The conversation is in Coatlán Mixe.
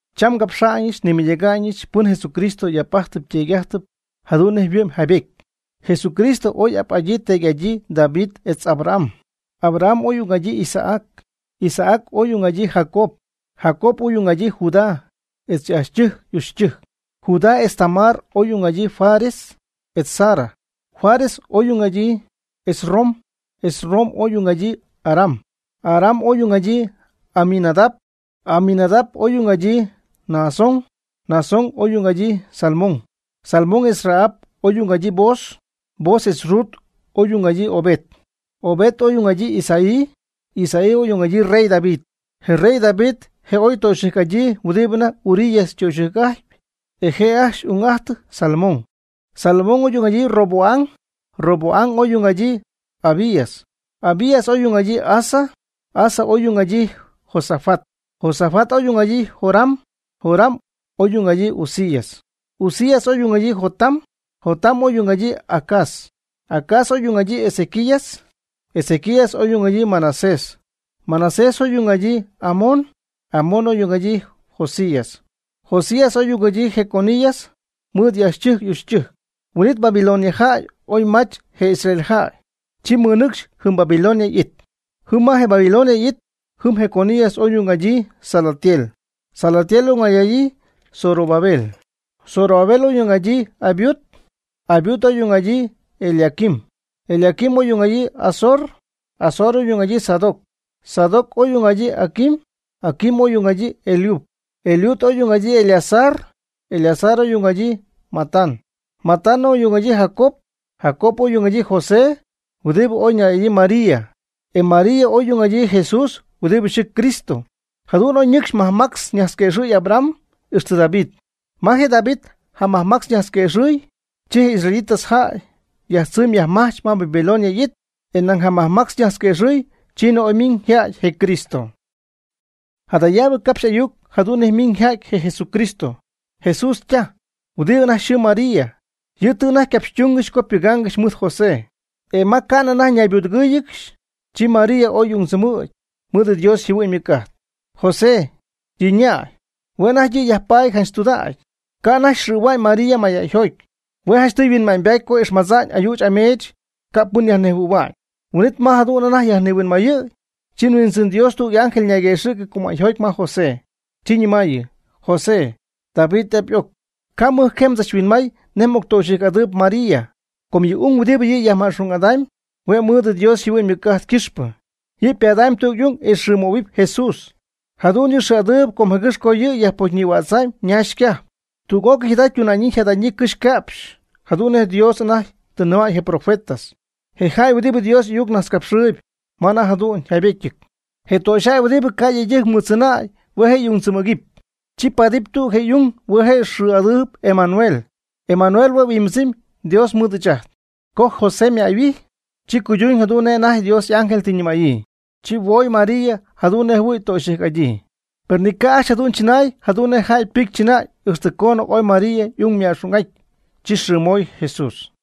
Cham ngapxa'ñ nmɨydäga'ñɨch pɨn Jesucristo y'ap'ajt yteedy'ajt jadu'n nej yhuɨ'my jaybety. Jesucristo je' oy ap'adyii teedy'adyii David etz Abraham. Abraham oy ung'adyii Isaac. Isaac oy ung'adyii Jacob. Jacob oy ung'adyii Judá etz y'ajchytɨjc y'uchytɨjc. Judá etz Tamar oy ung'adyii Fares etz Zara. Fares oy ung'adyii Esrom. Esrom oy ung'adyii Aram. Aram oy ung'adyii Aminadab. Aminadab oy ung'adyii Naasón. Naasón oy ung'adyii Salmón. Salmón etz Rahab oy ung'adyii Booz. Booz etz Rut oy ung'adyii Obed. Obed oy ung'adyii Isaí. Isaí oy ung'adyii rey David. Je rey David je' oy ytöxyɨjc'adyii huɨdɨ anajty Urías ytöxyɨjc'ajtpy. E je' ajcxy y'ung'ajtɨ Salomón. Salomón oy ung'adyii Roboam. Roboam oy ung'adyii Abías. Abías oy ung'adyii Asa. Asa oy ung'adyii Josafat. Josafat oy ung'adyii Joram. Joram oy ung'adyii Uzías. Uzías oy ung'adyii Jotam. Jotam oy ung'adyii Acaz. Acaz oy ung'adyii Ezequías. Ezequías oy ung'adyii Manasés. Manasés oy ung'adyii Amón. Amón oy ung'adyii Josías. Josías oy ung'adyii Jeconías mɨɨd y'ajchytɨjc y'uchytɨjc. Huin'it Babilonia jäy oy mach je israelitas jäy. Chi mɨnɨcxy jɨm Babilonia y'it. Jɨm ma je Babilonia y'it, jɨm Jeconías oy ung'adyii Salatiel. Salatiel oy ung'adyii Zorobabel. Zorobabel oy ung'adyii Abiud. Abiud oy ung'adyii Eliaquim. Eliaquim oy ung'adyii Azor. Azor oy ung'adyii Sadoc. Sadoc oy ung'adyii Aquim. Aquim oy ung'adyii Eliud. Eliud oy ung'adyii Eleazar. Eleazar oy ung'adyii Matán. Matán oy ung'adyii Jacob. Jacob oy ung'adyii José huɨdi oy ñäy'adyii María. E je María oy ung'adyii Jesús huɨdi yxɨɨ Cristo. Jadu'n oy ñɨcxy majmactz najtzquëxɨ' Abraham ixtɨ David. Ma je David jamajmactz najtzquëxɨ' chi je israelitas jäy yajtzɨmy yajmajch ma Babilonia y'it, e nañ jamajmactz najtzquëxɨ' chiinɨ oy ymiñ yja'ty je Cristo. Jadayab capxy ayuc jadu'n nej ymiñ yja'ty je Jesucristo. Jesús ytaj, huɨdi anajty yxɨɨ María, yɨ' tɨ anajty ycapxytungɨxy co ypɨgaangɨxy mɨɨd José; e ma anajty ca'nɨ ñaybudɨgɨ́ɨyɨgɨxy, chi María oy y'ungdzɨmɨ̈gy mɨɨd yɨ Dios yjɨhuɨ'ñ ymɨc'ajt. José, yɨ' ñäy, hue' anajty yɨ' yajpaty janch tudägy. Ca' anajty xɨ̈hua'ñ María mayjäyjoty. Hue' janchtɨy yhuinma'ñybaty co ixmadza'ñ ayüch ameech ca' pɨn yajnejhuɨ̈hua'ñ. Huin'it ma jadu'n anajty nihuinmayɨ̈y, chi Huindzɨn Dios tüg y'ángel ñayquëxɨ̈cɨ cumäyjoty ma José, chi ñɨmaayɨ: ―José, David y'ap y'oc, ca' mɨjcajee mdzachhuinmay nej m'octöxyɨjc'adɨɨyb María, com yɨ' y'ung huɨdibɨ yajma'xung'adamy hue' mɨɨd Dios yjɨhuɨ'ñ ymɨc'ajt ycɨxpɨ. Yɨ' ypadamy tüg y'ung e mxɨɨmöhuɨpy Jesús. Jadu'n yɨ' xɨɨ'adɨɨyb com jëgɨ́x co yɨ' yajpocyñïhuädzam ñaax ycajp. Tüg'ócɨy jada ytundaayɨ yjajtaayɨ ycɨjxy yca'pxy jadu'n nej je Dios anajty tɨ nɨmäy je profeta, je jäy huɨdi Dios y'ayuc najtzcapxɨɨyɨp ma anajty jadu'n yjaybetyɨty: Je töxyjäy huɨdibɨ ca' yëydɨjc mɨɨddzɨnäy hue' je' ung tzɨmɨ̈cɨp. Chi ypadamyb tüg je y'ung hue' je' yxɨɨ'adaanɨp Emanuel. Emanuel hue' yhuimbɨdzɨmy Dios mɨɨd ɨɨch ajt. Co José ymäyhuijy, chi cuyduñ jadu'n nej anajty Dios y'ángel tɨ nɨmäyii, chi huoy María jadu'n nej jɨhuɨɨy töxyɨjc'adyii. Per ni ca' ajcxy jadu'n chɨnaay jadu'n nej jäy ypɨcy chɨnäy ixtɨ coonɨ oy María y'ung yajma'xung'aty. Chi yxɨɨmoy Jesús.